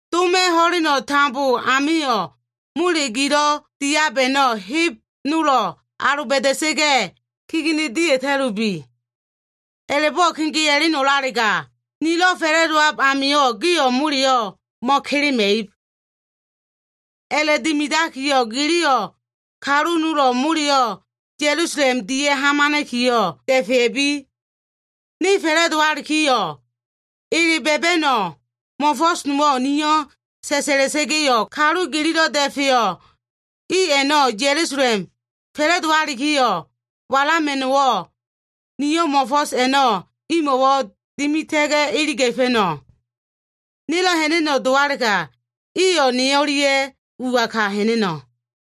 Dom ho꞉leno꞉ tambo amio꞉, mole gilo꞉ diab a꞉no꞉ heb nolo꞉ aloba꞉da꞉sa꞉ga꞉, kegene dia꞉ta꞉lubi. A꞉la꞉bo꞉ kegea꞉leno꞉lalega, nelo꞉ fa꞉la꞉dowab amio꞉ gio꞉ moleyo꞉ mo꞉kelema꞉ib. A꞉la꞉dimidakiyo꞉, giliyo꞉ kalu nolo꞉ moleyo꞉ Ya꞉lusalem dia꞉ hamana꞉kiyo꞉ da꞉fea꞉bi. Ne fa꞉la꞉dowalikiyo꞉, ele ba꞉ba꞉no꞉ mo꞉fo꞉so꞉ nowo꞉ niyo꞉ sa꞉la꞉sa꞉ga꞉yo꞉, kalu gililo꞉ da꞉feyo꞉ i a꞉no꞉ Ya꞉lusalem fa꞉la꞉dowakilo꞉ walama꞉no꞉wo꞉, niyo꞉ mo꞉fo꞉s a꞉no꞉ imo꞉wo꞉ dimita꞉ga꞉ iliga꞉fa꞉no꞉. Nelo꞉ ha꞉na꞉no꞉ dowalega, iyo꞉ ne o꞉lia꞉ ua ka ha꞉na꞉no꞉.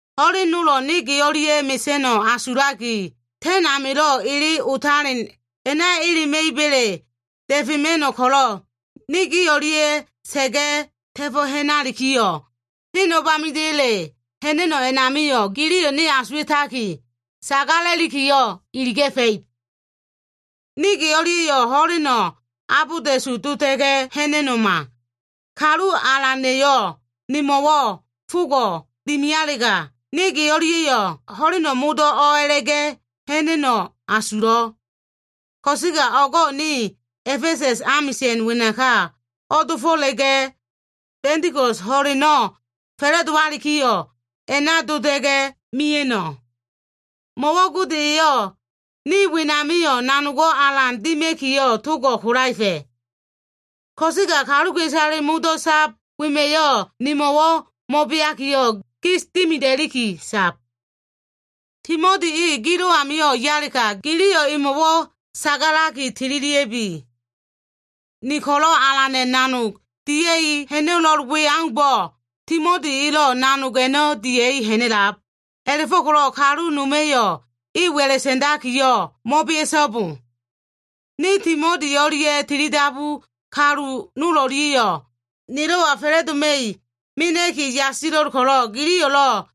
Ho꞉len nolo꞉ ne ge o꞉lia꞉ mesa꞉no꞉ asulaki, ta꞉n amilo꞉ ele otaleno꞉ a꞉na elema꞉iba꞉le da꞉fema꞉no꞉ ko꞉lo꞉, ne gi o꞉lia꞉ sa꞉ga꞉, ta꞉fo꞉ ha꞉nalikiyo꞉, ne hen o꞉bamida꞉ya꞉le ha꞉na꞉no꞉ a꞉namio꞉, giliyo꞉ ne asuwa꞉taki, sagala꞉likiyo꞉ iliga꞉fa꞉ib. Ne ge o꞉lia꞉yo꞉ ho꞉leno꞉ abolda꞉su dota꞉ga꞉ ha꞉na꞉no꞉ma. Kalu Alana꞉yo꞉ nemo꞉wo꞉ fogo꞉ dimialega, ne ge o꞉lia꞉yo꞉ ho꞉leno꞉ modo꞉ o꞉a꞉la꞉ga꞉ ha꞉na꞉no꞉ asulo꞉. Ko꞉sega o꞉go꞉ ne A꞉fesa꞉s amisa꞉n wenaka o꞉dofo꞉la꞉ga꞉, Ba꞉ndiko꞉s ho꞉leno꞉ fa꞉la꞉dowalikiyo꞉, a꞉na dota꞉ga꞉ mia꞉no꞉. Mo꞉wo꞉ Gode eyo꞉ ne wenamio꞉ nanogo꞉ alan dima꞉kiyo꞉ togo꞉ kolaefa꞉. Ko꞉sega kaluka꞉isale modo꞉ sab wema꞉yo꞉, nemo꞉wo꞉ mo꞉beakiyo꞉ gis dimida꞉liki sab. Timoti e gilo꞉ amio꞉ yalega, giliyo꞉ emo꞉wo꞉ sagalaki tililia꞉bi. Ne ko꞉lo꞉ Alana꞉ nanog dia꞉i ha꞉na꞉lo꞉l we aumbo꞉, Timoti elo꞉ nanog a꞉no꞉ dia꞉i ha꞉na꞉lab. A꞉la꞉fo꞉ko꞉lo꞉ kalu noma꞉yo꞉ e wa꞉la꞉ sa꞉ndakiyo꞉ mo꞉bea꞉so꞉bo. Ne Timoti o꞉lia꞉ tilidabu kalu nol o꞉lia꞉yo꞉ nelo꞉wa fa꞉la꞉doma꞉ mena꞉ki yasilo꞉l ko꞉lo꞉, giliyo꞉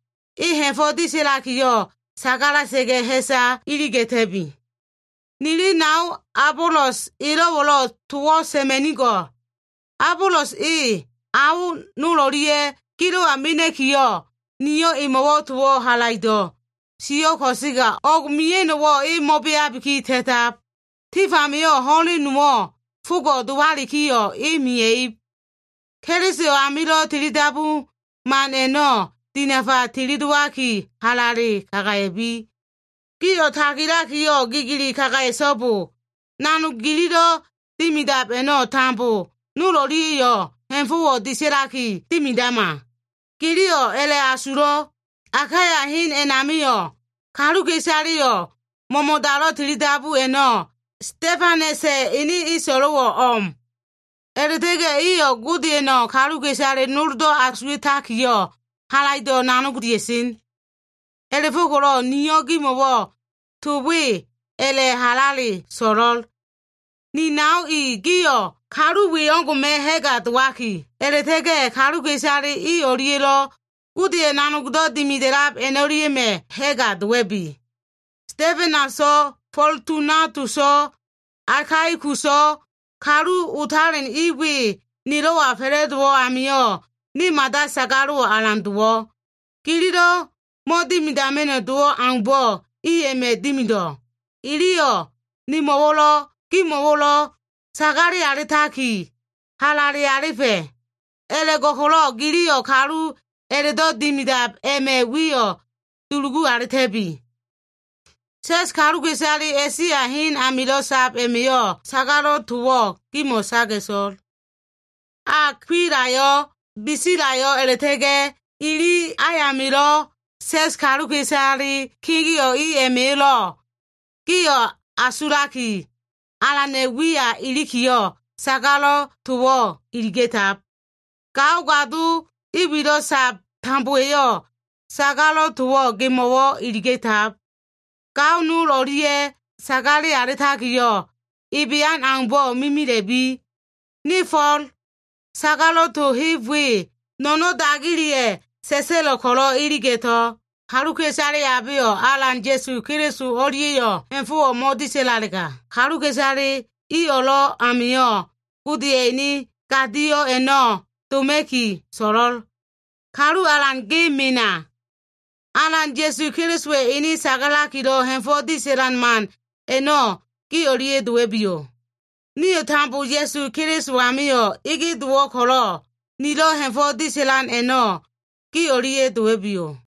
e ha꞉fo꞉ disa꞉lakiyo꞉ sagala꞉sa꞉ga꞉, ha꞉sa iliga꞉ta꞉bi. Nili nao Abolos elo꞉wo꞉lo꞉ towo꞉ sa꞉ma꞉nigo꞉l. Abolos e ao nol o꞉lia꞉ gilo꞉wa mena꞉kiyo꞉, niyo꞉ emo꞉wo꞉ towo꞉ halaido꞉ sio꞉, ko꞉sega o꞉g mia꞉no꞉wo꞉ e mo꞉beabiki ta꞉tab. Tif amio꞉ ho꞉len nowo꞉ fogo꞉ dowalikiyo꞉ e mia꞉ib. Keliso amilo꞉ tilidabu man a꞉no꞉ dinafa tilidowaki, halale kagaya꞉bi. Gio꞉ tagilakiyo꞉ gigili kagaya꞉so꞉bo. Nanog gililo꞉ dimidab a꞉no꞉ tambo, nol o꞉lia꞉yo꞉ ha꞉fo꞉ disa꞉laki dimidama. Giliyo꞉ a꞉la꞉asulo꞉. Akaya hen a꞉namio꞉, kaluka꞉isaleyo꞉ mo꞉mo꞉dalo꞉ tilidabu a꞉no꞉, Stefanasa꞉ ene eso꞉lo꞉ o꞉m. A꞉la꞉ta꞉ga꞉ iyo꞉ Godeya꞉no꞉ kaluka꞉isale nolo꞉ asuwa꞉takiyo꞉ halaido꞉ nanog dia꞉sen. A꞉la꞉fo꞉ko꞉lo꞉ niyo꞉ gimo꞉wo꞉ to we a꞉la꞉ halale so꞉lo꞉l. Ni nao i gio꞉, kalu we o꞉ngo꞉ma꞉ ha꞉ga dowaki, a꞉la꞉ta꞉ga꞉ kaluka꞉isale i o꞉lia꞉lo꞉ Godeya꞉ nanogdo꞉ dimida꞉lab a꞉no꞉lia꞉ma꞉ ha꞉ga dowa꞉bi. Stefanaso꞉, Fotunatuso꞉, Akaikuso꞉ kalu otalen i we nelo꞉wa fa꞉la꞉dowo꞉ amio꞉, ne mada sagalo꞉wo꞉ alan dowo꞉. Gililo꞉ mo꞉dimidama꞉no꞉ dowo꞉ aumbo꞉ i a꞉ma꞉ dimido꞉. Iliyo꞉ nemo꞉wo꞉lo꞉ gimo꞉wo꞉lo꞉ sagale alitaki, halale alifa꞉. A꞉la꞉go꞉ko꞉lo꞉ giliyo꞉ kalu a꞉la꞉do꞉ dimidab a꞉ma꞉ wiyo꞉ dulugu alita꞉bi. Sa꞉s kaluka꞉isale A꞉sia hen amilo꞉ sab a꞉ma꞉yo꞉ sagalo꞉ towo꞉ gimo꞉ saga꞉to꞉l. Akwilayo꞉, Bisilayo꞉, a꞉la꞉ta꞉ga꞉ ili ayamilo꞉ sa꞉s kaluka꞉isale kegeo꞉ i a꞉ma꞉yo꞉lo꞉ gio꞉ asulaki, Alana꞉ wiya ilikiyo꞉, sagalo꞉ towo꞉ iliga꞉tab. Gao gado i wilo꞉ sab tambowa꞉yo꞉ sagalo꞉ towo꞉ gemo꞉wo꞉ iliga꞉tab. Gao nol o꞉lia꞉ sagale alitakilo꞉ ebean aumbo꞉ mimila꞉bi. Ne Fo꞉l, sagalo꞉ to heb we no꞉no꞉n dagileya꞉ sa꞉sa꞉lo꞉ ko꞉lo꞉ iliga꞉to꞉l. Kaluka꞉isale abeyo꞉ Alan Ya꞉su Keliso o꞉lia꞉yo꞉ ha꞉fo꞉wo꞉ mo꞉disa꞉lalega, kaluka꞉isale i o꞉lo꞉ amio꞉ Godeya꞉ ene gadio꞉ a꞉no꞉ doma꞉ki so꞉lo꞉l. Kalu Alan, ge mena. Alan Ya꞉su Kelisowa꞉ ene sagalakilo꞉ ha꞉fo꞉ disa꞉lan man a꞉no꞉ gi o꞉lia꞉ dowa꞉biyo꞉. Nio꞉ tambo Ya꞉su Keliso amio꞉ ege dowo꞉ ko꞉lo꞉, nilo꞉ ha꞉fo꞉ disa꞉lan a꞉no꞉ gi o꞉lia꞉ dowa꞉biyo꞉.